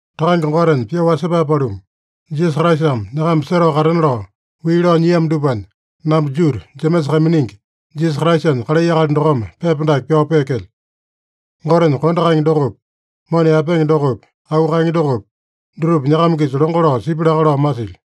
Takange Gotenya pyoo wasepae paluma, Jisasa Kraisame nyakama setao katena lao wii lao nyiamo dupanya, namba Judu, Jemesa kaiminingi, Jisasa Kraisanya kalai akali dokome pepa dake pyao peekelyo. Gotenya kondo kaenge dokopi, mona yaepenge dokopi, auu kaenge dokopi, dutupa nyakama-kisa longo lao sipya laka lao masilyo.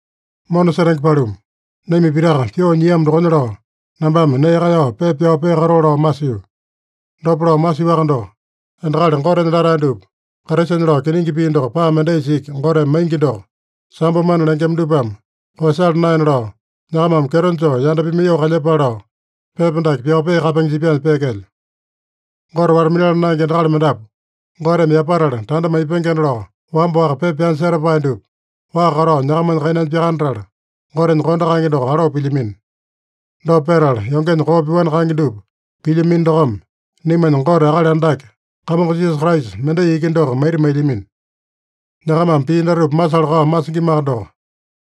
Mona setenge paluma, naima pitaka pyoo nyiamo dokonya lao, nambame nee kaeyao pepa pyao peakatoo lao masio. Dopa lao masiowaka doko, endakali Gotenya latae dupa Kraisanya lao kiningi pii doko paa mendaisa iki Goteme maingi doko, sambo mana lengema dupame koeyasala naena lao, nyakamame kyeto joo yanda pimaiyoo kalyepale lao, pepa dake pyao peakapenge jipyanya peekelyo. Gote wata-minala naenge endakali mendapu, Goteme yapatala tanda maipengena lao wamba-waka pepa pyanya setapae dupa, waa katao nyakamanya kainanya pyakanatala, Gotenya kondo kaenge doko aloo pilyamino. Dopa petala, yongenya koo pyoani kaenge dupa pilyamino dokome, naimanya Gote Akali Andake Kamongo Jisasa Kraisa, mendai iki doko maita mailyamino. Nyakamame pii datupa masala-kao masingimaka doko,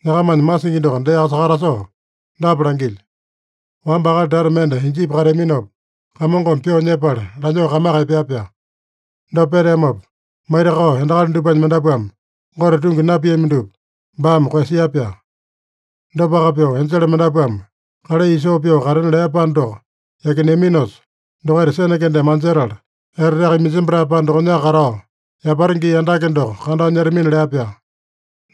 nyakamanya masingi doko deaka sakatasoo dapa langilyo: Wamba akali tata mende Ijipi kateaminopa, Kamongome pyoo nyepala lanyoo kamaka epea-pyaa. Dopa peteamopa, maitakao endakali dupanya mendapuame Gote tungi napiami dupa baame koeyasia-pyaa. Dopaka pyoo enjele mendapuame kalai isoo pyoo katena lea panda doko yakineaminosa, dokaita sene kendeme anjetala, eteteaka iminjembatae panda dokonyaka katao, yapata gii andake doko kandao nyetamina lea-pyaa.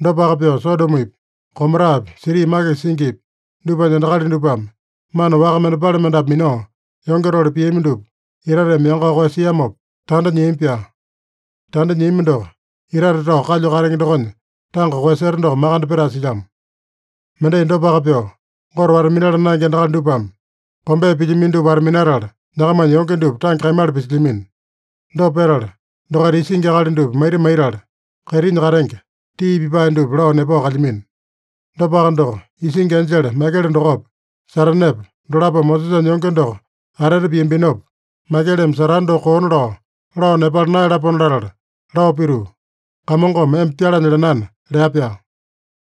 Dopaka pyoo Sodomopi, Gomorapi, siti makisa singipi, dupanya endakali dupame mana waka mendepale mendapu minao, yonge tole piami dupa itateme yangao koeyasiamopa, tanda nyiami-pyaa. Tanda nyiami doko, itate tao kalyu katenge dokonya tanga koeyaseta doko makande petae silyamo. Mendai dopaka pyoo, Gote wata-minala naenge endakali dupame kombea pilyamino dupa wata-minatala, nyakamanya yonge dupa tange kaimala pisilyamino. Dopa petala, dokaita isingi akali dupa maita maitala, kaitinya katenge tii pipae dupa lao nepao kalyamino. Dopaka doko, isingi enjele Maikele dokopa, Satanepa, dolapome Mosesanya yonge doko atete piambinopa, Maikeleme Satane doko koona lao, lao nepala naeyalapona latala lao pituu, “Kamongome emba pyalanya lenana” lea-pyaa.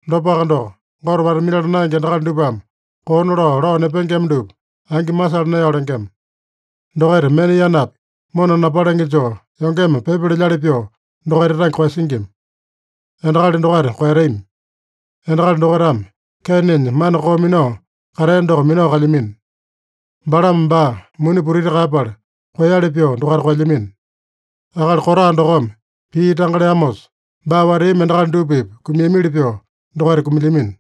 Dopaka doko, Gote wata-minala naenge endakali dupame koona lao, lao nepengema dupa angi masala naeyao lengema. Dokaita mena yanapi mona napalenge joo, yongeme pyepa lelyali pyoo dokaita tange koeyasingima. Endakali dokaita koeyatami! Endakali dokaitame Keinenya mana koo minao katea doko minao kalyamino. Balame baa muni putiti kaeyapala koeyali pyoo dokaita koelyamino. Akali Kora dokome pii tanga leamosa, baa wateami endakali dupa-pipa kumiamili pyoo dokaita kumilyamino.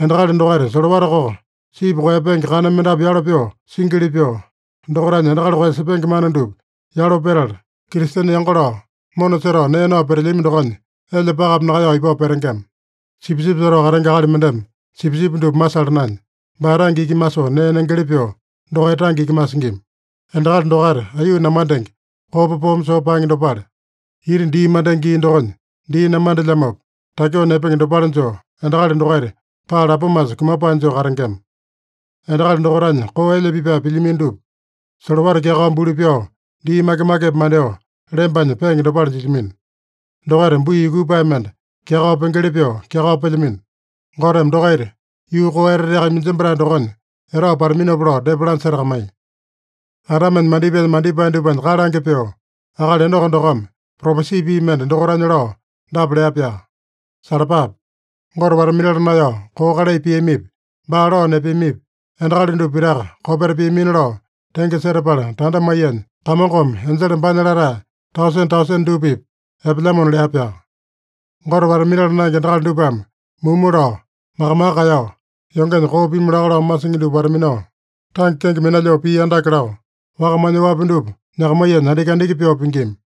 Endakali dokaita solowata koko sipi koeyapenge kana mendapu yalo pyoo singili pyoo, dokaitanya endakali koeyasepenge mana dupa yalo petala, Kristene yango lao mona setao nee nao petelyami dokonya, elya pakapi nakaeyao ipao petengema. Sipisipi setao katenge akali mendeme sipisipi dupa masala naenya, baa tange iki masoo nee nengeli pyoo, dokaita tange iki masingima. Endakali dokaita aiyuu namandenge, kopa poome soo paenge dopale. Ita dii mandenge gii dokonya dii namandelyamopa, takyoo nepenge dopale joo, endakali dokaita paa lapomasa kumapae joo katengema. Endakali dokaitanya koo elya pipae pilyamino dupa, solowata kyakao buli pyao, dii make-makepi mandyoo lembanya peenge dopale jilyamino. Dokaita bui yukupae mende kyakao pengeli pyoo kyakao pelyamino. Goteme dokaita yuu koo eteteaka iminjembatae dokonya etao pataminopa lao depa lanya setakamaiya. Adamenya mandipaenya mandipae dupanya kalange pyoo, akali Enoko dokome propesi pii mende dokaitanya lao dapa lea-pyaa: “Salapape! Gote wata-minala naeyao koo kalai piamipi, baa lao nepeamipi, endakali dupa pitaka kopeta piamina lao tenge setapala tanda maiyanya, Kamongome enjele baanya latae tausene-tausene dupa-pipa epelyamona” lea-pyaa. Gote wata-minala naenge endakali dupame mumu lao, maka-maka kaeyao, yongenya koo pimu laka lao masingi dupa wata-minao, tange kenge minalyoo pii andake lao, wakamanya oapi dupa nyakamaiyanya andiki-andiki pyoo pingima.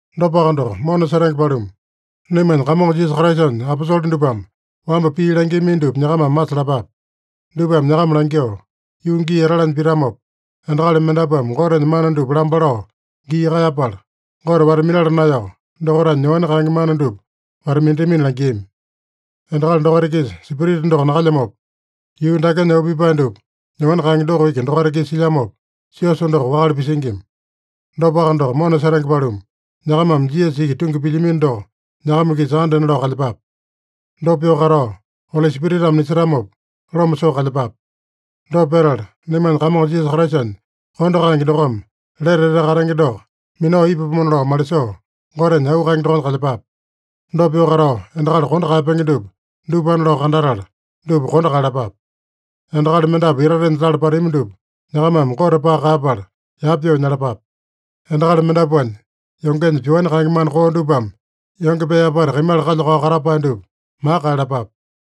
Dopaka doko, mona setenge paluma, naimanya Kamongo Jisasa Kraisanya aposole dupame wamba pii langiamino dupa nyakamame masalapape. Dupame nyakama langyoo, “Yuu gii etalanya pitamopa, endakali mendapuame Gotenya mana dupa lamba lao gii kaeyapala, Gote wata-minala naeyao, dokaitanya nyoani kaenge mana dupa wata-minatamina” langiami. Endakali dokaita-kisa Spirita doko nakalyamopa, yuu dakenya auu pipae dupa nyoani kaenge doko iki dokaita-kisa silyamopa, siosa doko wakale pisingima. Dopaka doko, mona setenge paluma, nyakamame Jisasa iki tungi pilyamino doko nyakama-kisa andena lao kalyepape. Dopa pyoo katao, Oli Spiritame nisetamopa loma soo kalyepape. Dopa petala, naimanya Kamongo Jisasa Kraisanya kondo kaenge dokome lete etete katenge doko minao ipapomona lao malisoo, Gotenya auu kaenge dokonya kalyepape. Dopa pyoo katao, endakali kondo kaeyapenge dupa, dupana lao kandatala, dupa kondo kaeyalapape. Endakali mendapu itatenya tala patami dupa nyakamame Gote paka kaeyapala, yapa pyoo nyalapape. Endakali mendapuanya yongenya pyoani kaenge mana koo dupame yonge pee apata kaimala kalya-kao katapae dupa maka kaeyalapape.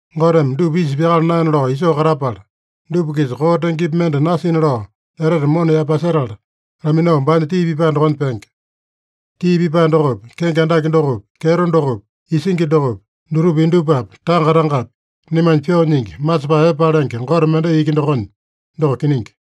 Goteme dupa isa pyakala naena lao isoo katapala, dupa-kisa koo tengepi mende nasina lao etete mona yaepasetala, laminao baanya tii pipae dokonya penge. Tii pipae dokopi, kenge andake dokopi, kyeto dokopi, isingi dokopi, dutupa indupapi, tanga-tangapi, naimanya pyoo nyingi, masepae epe palenge Gote mendai iki dokonya. Doko kiningi.